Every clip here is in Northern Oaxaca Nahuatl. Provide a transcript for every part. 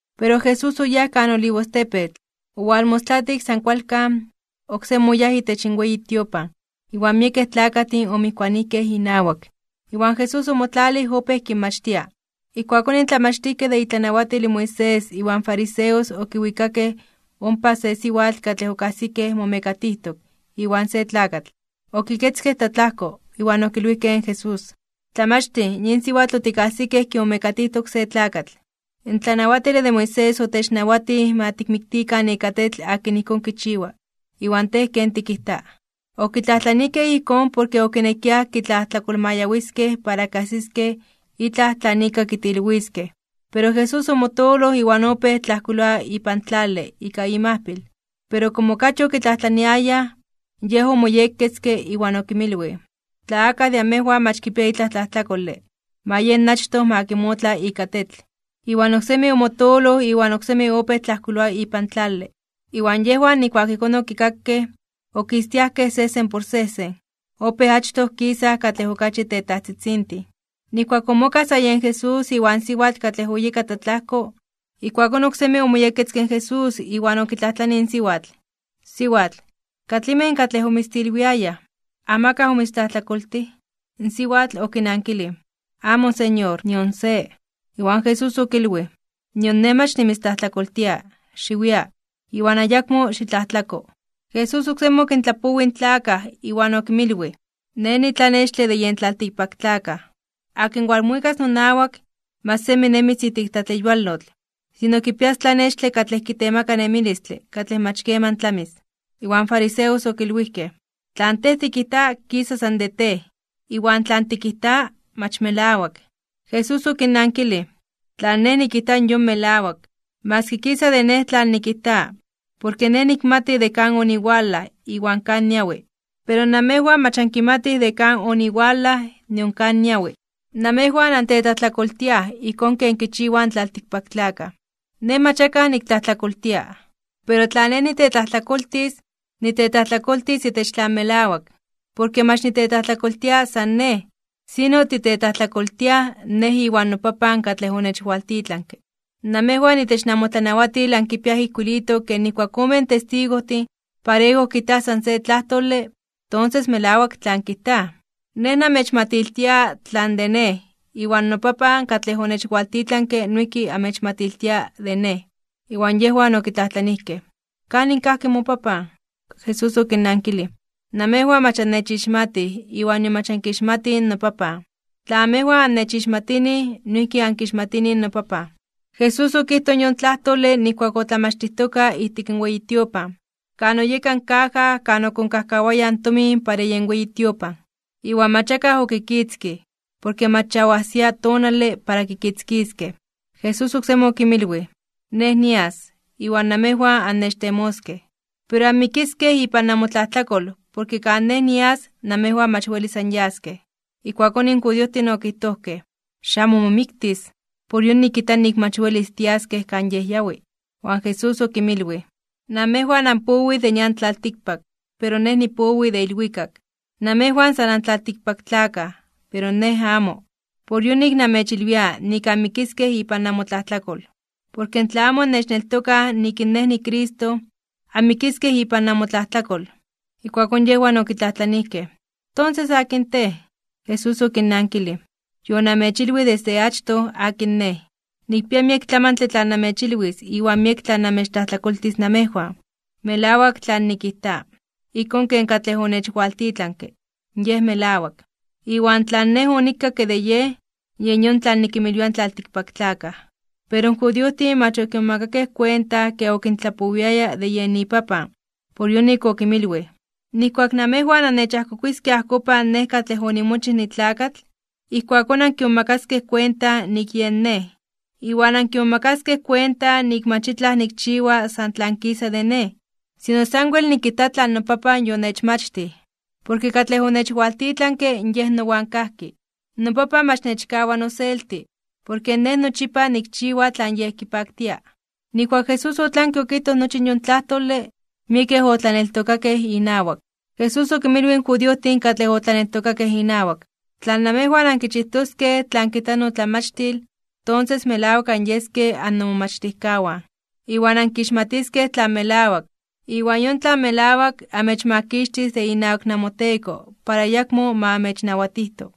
Pero Jesús oyáj kan Olivostepetl. Owalmostlatik san kualkan, oksemi oyáj itech in weyi tiopan, iwan miekej tlakajtin omijkuanijkej inawak. Iwan Jesús omotlalij opéj kinmachtia. Ijkuakón in tlamachtijkej de itlanawatil in Moisés iwan in fariseos okiwikakej ompa se siwatl katlej okajsikej momekatijtok iwan se tlakatl. Iwan okiketzkej tlatlajko. Iwan okilwijkej in Jesús: ―Tlamachtij, yin siwatl otikajsikej kimomekatijtok se tlakatl. In tlanawatile de Moisés otechnawatij ma tikmiktikan ika tetl akin ijkón kichiwa. ¿Iwan Tej ken tikijta? Okitlajtlanijkej ijkón porke okinekiaj kitlajtlakolmayawiskej para kajsiskej itlaj tlan ika kitilwiskej. Pero Jesús omotooloj iwan opéj tlajkuiloa ipan tlale ika imajpil. Pero komo okachi okitlajtlaniayaj, Yej omoyekketzke iwan okinmilwij: ―Tla akaj de amejwan mach kipia itlaj tlajtlakole, ma yen achtoj ma kimotla ika tetl. Iwan oksemi omotooloj iwan oksemi opéj tlajkuiloa ipan tlale. Iwan yejwan nijkuak ijkón okikakej, okistiajkej sejsen por sejsen. Opéj achtoj kisaj katlej okachi tetajtzitzintin. Nijkuak omokaj sa yen Jesús iwan siwatl katlej oyeka tlatlajko, ijkuakón oksemi omoyekketzke in Jesús iwan okitlajtlanij in siwatl: ―Siwatl, ¿katlimej katlej omitztilwiayaj? ¿Amakaj omitztlajtlakoltij? In siwatl okinankilij: ―Amo, Señor. Nion se. Iwan Jesús okilwij: ―Nion Nej mach nimitztlajtlakoltia. Xiwia, iwan ayakmo xitlajtlako. Jesús oksemi okintlapowij in tlakaj, iwan okinmilwij: ―Nej nitlanextle de yen tlaltikpaktlakaj, akin walmuikas nonawak, mach semi nemis ijtik tlatleyualotl, sino kipias tlanextle katlej kitemaka nemilistle katlej mach keman tlamis. Iwan in fariseos okilwijkej: ―Tlan Tej tikijta kisa san de Tej. Iwan tlan tikijta mach melawak. Jesús okinnankilij: ―Tlan Nej nikijta yon melawak, maski kisa de Nej tlan nikijta, porke Nej nikmati de kan oniwalaj iwan kan niawi. Pero namejwan mach ankimatij de kan oniwalaj nion kan niawi. Namejwan antetlajtlakoltiaj ijkón ken kichiwaj in tlaltikpaktlakaj. Nej mach akaj niktlajtlakoltia. Pero tla Nej nitetlajtlakoltis, nitetlajtlakoltis itech tlan melawak, porke mach nitetlajtlakoltia san Nej, sino titetlajtlakoltiaj Nej iwan noPapan katlej onechwaltitlanke. Namejwan itech namotlanawatil ankipiaj ijkuilitok ke nijkuak omen testigojtin parejo kijtaj san se tlajtole, tonses melawak tlan kijtaj. Nej namechmatiltia tlan de Nej, iwan noPapan katlej onechwaltitlanke noijki amechmatiltia de Nej. Iwan yejwan okitlajtlanijkej: ―¿Kanin kajki moPapan? Jesús okinnankilij: ―Namejwan mach annechixmatij, iwan nion mach ankixmatij noPapan. Tla amejwan anechixmatinij, noijki ankixmatinij noPapan. Jesús okijtoj yon tlajtole nijkuak otlamachtijtoka ijtik in weyi tiopan, kan oyeka in kaja kan okonkajkawayaj in tomin para yen weyi tiopan. Iwan mach akaj okikitzkij, porke mach ya oajsia tonale para kikitzkiskej. Jesús oksemi okinmilwij: ―Nej nias, iwan namejwan annechtemoskej, pero anmikiskej ipan nanmotlajtlakol porke kan Nej nias namejwan mach welis anyaskej. Ijkuakón in judiojtin okijtojkej: ―¿Xamo momiktis, por yonik kijta nik mach welis tiaskej kan Yej yawi? Iwan Jesús okinmilwij: ―Namejwan anpowij de nian tlaltikpak, pero Nej nipowi de ilwikak. Namejwan san antlaltikpaktlakaj, pero Nej amo. Por yonik namechilwia nik anmikiskej ipan namotlajtlakol, porke tla amo annechneltokaj nik in Nej niCristo, anmikiskej ipan namotlajtlakol. Ijkuakón yejwan okitlajtlanijkej: ―Tonses, ¿akin Tej? Jesús okinnankilij: ―Yonamechilwij desde achtoj akin Nej. Nikpia miek tlamantle tlan namechilwis iwan miek tlan namechtlajtlakoltis namejwan. Melawak tlan nikijta, ijkón ken katlej onechwaltitlanke Yej melawak. Iwan tlan Nej onikakke de Yej, yen yon tlan nikimilwia in tlaltikpaktlakaj. Pero in judiojtin mach okimomakakej kuenta ke okintlapowiaya de yen iPapan. Por yonik okinmilwij: ―Nijkuak namejwan annechajkokuiskej ajkopan Nej katlej onimochij nitlakatl, ijkuakón ankimomakaskej kuenta nik yen Nej. Iwan ankimomakaskej kuenta nik mach itlaj nikchiwa san tlan kisa de Nej, sino sanwel nikijta tlan noPapan yonechmachtij. Porke katlej onechwaltitlanke Yej nowan kajki. NoPapan mach nechkawa noselti, porke Nej nochipa nikchiwa tlan Yej kipaktia. Nijkuak in Jesús otlanke okijtoj nochi yon tlajtole, miekej otlaneltokakej inawak. Jesús okinmilwij in judiojtin katlej otlaneltokakej inawak: ―Tla namejwan ankichijtoskej tlan kijta notlamachtil, tonses melawak anyeskej annomomachtijkawan. Iwan ankixmatiskej tlan melawak, iwan yon tlan melawak amechmakixtis de inawak namoteko para ayakmo ma amechnawatijto.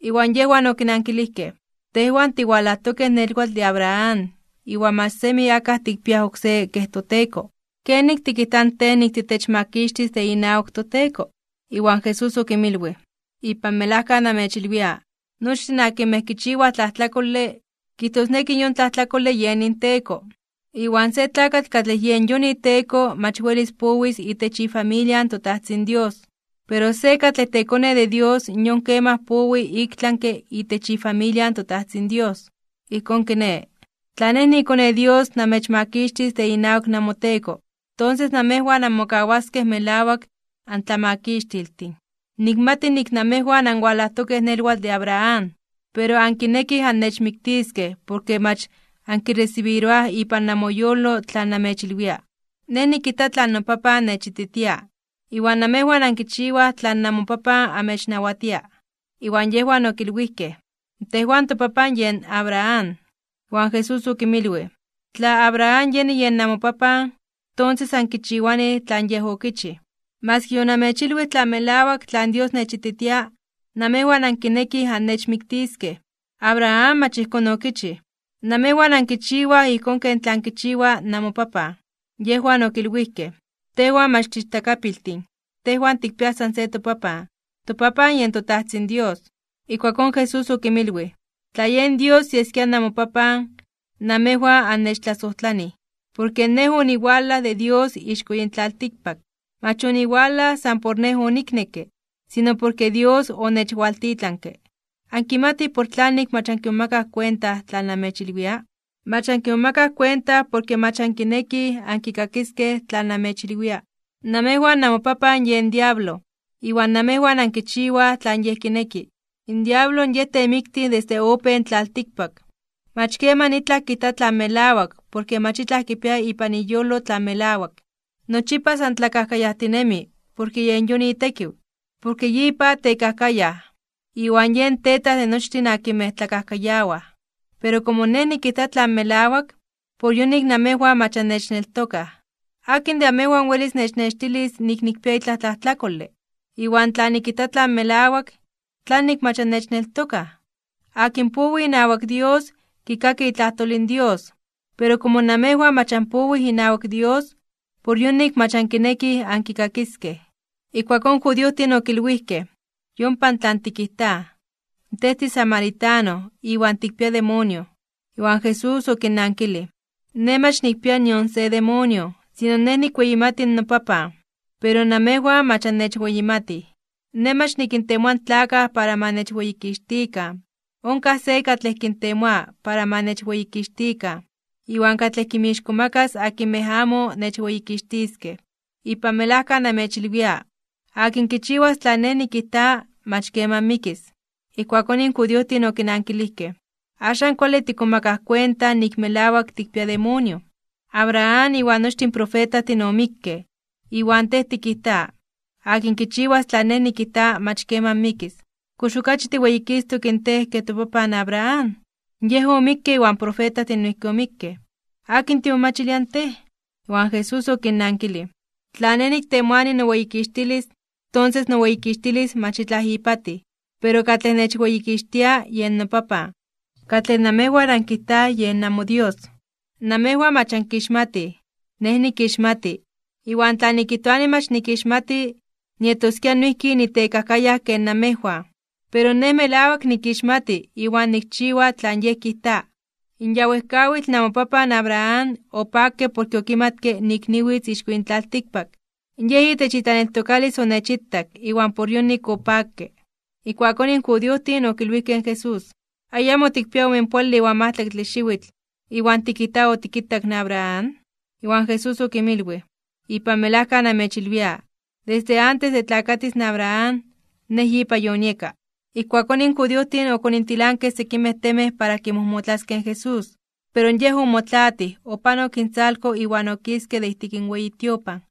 Iwan yejwan okinankilijkej: ―Tejwan tiwalajtokej nelwatl de Abraham, iwan mach semi akaj tikpiaj oksé kej toteko. ¿Kenik tikijta in Tej nik titechmakixtis de inawak toteko? Iwan Jesús okinmilwij: ―Ipan melajka namechilwia, nochtin akinmej kichiwaj tlajtlakole, kijtosneki yon tlajtlakole yen inteko. Iwan se tlakatl katlej yen yon iteko mach welis powis itech ifamilia in toTajtzin Dios, pero se katlej tekone de Dios yon kemaj powi iktlanke (ik tlami) itech ifamilia in toTajtzin Dios. Ijkón kiné, tla Nej niiKone in Dios namechmakixtis de inawak namoteko, tonses namejwan anmokawaskej melawak antlamakixtiltin. Nikmati nik namejwan anwalajtokej nelwatl de Abraham. Pero ankinekij annechmiktiskej porke mach ankiresibiroaj ipan namoyolo tlan namechilwia. Nej nikijta tlan noPapan nechititia, iwan namejwan ankichiwaj tlan namopapan amechnawatia. Iwan yejwan okilwijkej: ―Tejwan topapan yen Abraham. Iwan Jesús okinmilwij: ―Tla Abraham yeni yen namopapan, tonses ankichiwanij tlan yej okichij. Maski yonamechilwij tlan melawak tlan Dios nechititia, namejwan ankinekij annechmiktiskej. Abraham mach ijkón okichij. Namejwan ankichiwaj ijkón ken tlan kichiwa namopapan. Yejwan okilwijkej: ―Tejwan mach tiichtakapiltin, tejwan tikpiaj san se topapan, topapan yen toTajtzin Dios. Ijkuakón Jesús okinmilwij: ―Tla yen Dios yeskia namopapan, namejwan annechtlasojtlanij, porke Nej oniwalaj de Dios ixko yin tlaltikpak. Mach oniwalaj san por Nej oniknekke, sino porke Dios onechwaltitlanke. ¿Ankimatij por tlanik mach ankimomakaj kuenta tlan namechilwia? Mach ankimomakaj kuenta porke mach ankinekij ankikakiskej tlan namechilwia. Namejwan namopapan yen diablo, iwan namejwan ankichiwaj tlan yej kineki. In diablo yej temiktij desde opejke in tlaltikpak. Mach keman itlaj kijta tlan melawak porke mach itlaj kipia ipan iyolo tlan melawak. Nochipa san tlakajkayajtinemi porke yen yon itekiw, porke yipa tekajkayaj, iwan yen tetaj de nochtin akinmej tlakajkayawaj. Pero komo Nej nikijta tlan melawak, por yonik namejwan mach annechneltokaj. ¿Akin de amejwan welis nechnextilis nik nikpia itlaj tlajtlakole? Iwan tla nikijta tlan melawak, ¿tlanik mach annechneltokaj? Akin powi inawak Dios, kikaki itlajtol in Dios, pero komo namejwan mach anpowij inawak Dios, por yonik mach ankinekij ankikakiskej. Iwan ijkuakón in judiojtin okilwijkej: ―Yompa tlan tikijtaj, Tej tisamaritano iwan tikpia demonio. Iwan Jesús okinnankilij: ―Nej mach nikpia nion se demonio, sino Nej nikweyimati in noPapan. Pero namejwan mach annechweyimatij. Nej mach nikintemoa in tlakaj para ma nechweyikixtikan, onkaj se katlej kintemoa para ma nechweyikixtikan, iwan katlej kinmixkomakas akinmej amo nechweyikixtiskej. Ipan melajka namechilwia, akin kichiwas tlan Nej nikijta, mach keman mikis. Ijkuakón in judiojtin okinankilijkej: ―Axan kuale tikmomakaj kuenta nik melawak tikpia demonio. Abraham iwan nochtin in profetajtin omikkej, iwan Tej tikijta: “Akin kichiwas tlan Nej nikijta, mach keman mikis.” ¿Kox okachi tiweyikistok in Tej ke topapan Abraham? Yej omikke iwan in profetajtin noijki omikkej. ¿Akin timomachilia in Tej? Iwan Jesús okinnankilij: ―Tla Nej niktemoani noweyikixtilis, tonses noweyikixtilis mach itlaj ipatij. Pero katlej nechweyikixtia, yen noPapan, katlej namejwan ankijtaj yen namoDios. Namejwan mach ankixmatij. Nej nikixmati, iwan tla nikijtoani mach nikixmati, nietoskia noijki nitekajkayaj ken namejwan. Pero Nej melawak nikixmati, iwan nikchiwa tlan Yej kijta. In ya wejkawitl namopapan Abraham, opakke porke okimatke nik niwitz ixko yin tlaltikpak. Yej itech itlaneltokalis onechitak iwan por yonik opakke. Ijkuakón in judiojtin okilwijkej in Jesús: ―Ayamo tikpia omenpoale iwan majtlaktle xiwitl, ¿iwan tikijta otikitak in Abraham? Iwan Jesús okinmilwij: ―Ipan melajka namechilwia, desde antes de tlakatis in Abraham, Nej yipa yonieka. Ijkuakón in judiojtin okonintilankej sekimej temej para kimojmotlaskej in Jesús. Pero Yej omotlaatij, opanok intzalko iwan okiske de ijtik in weyi tiopan.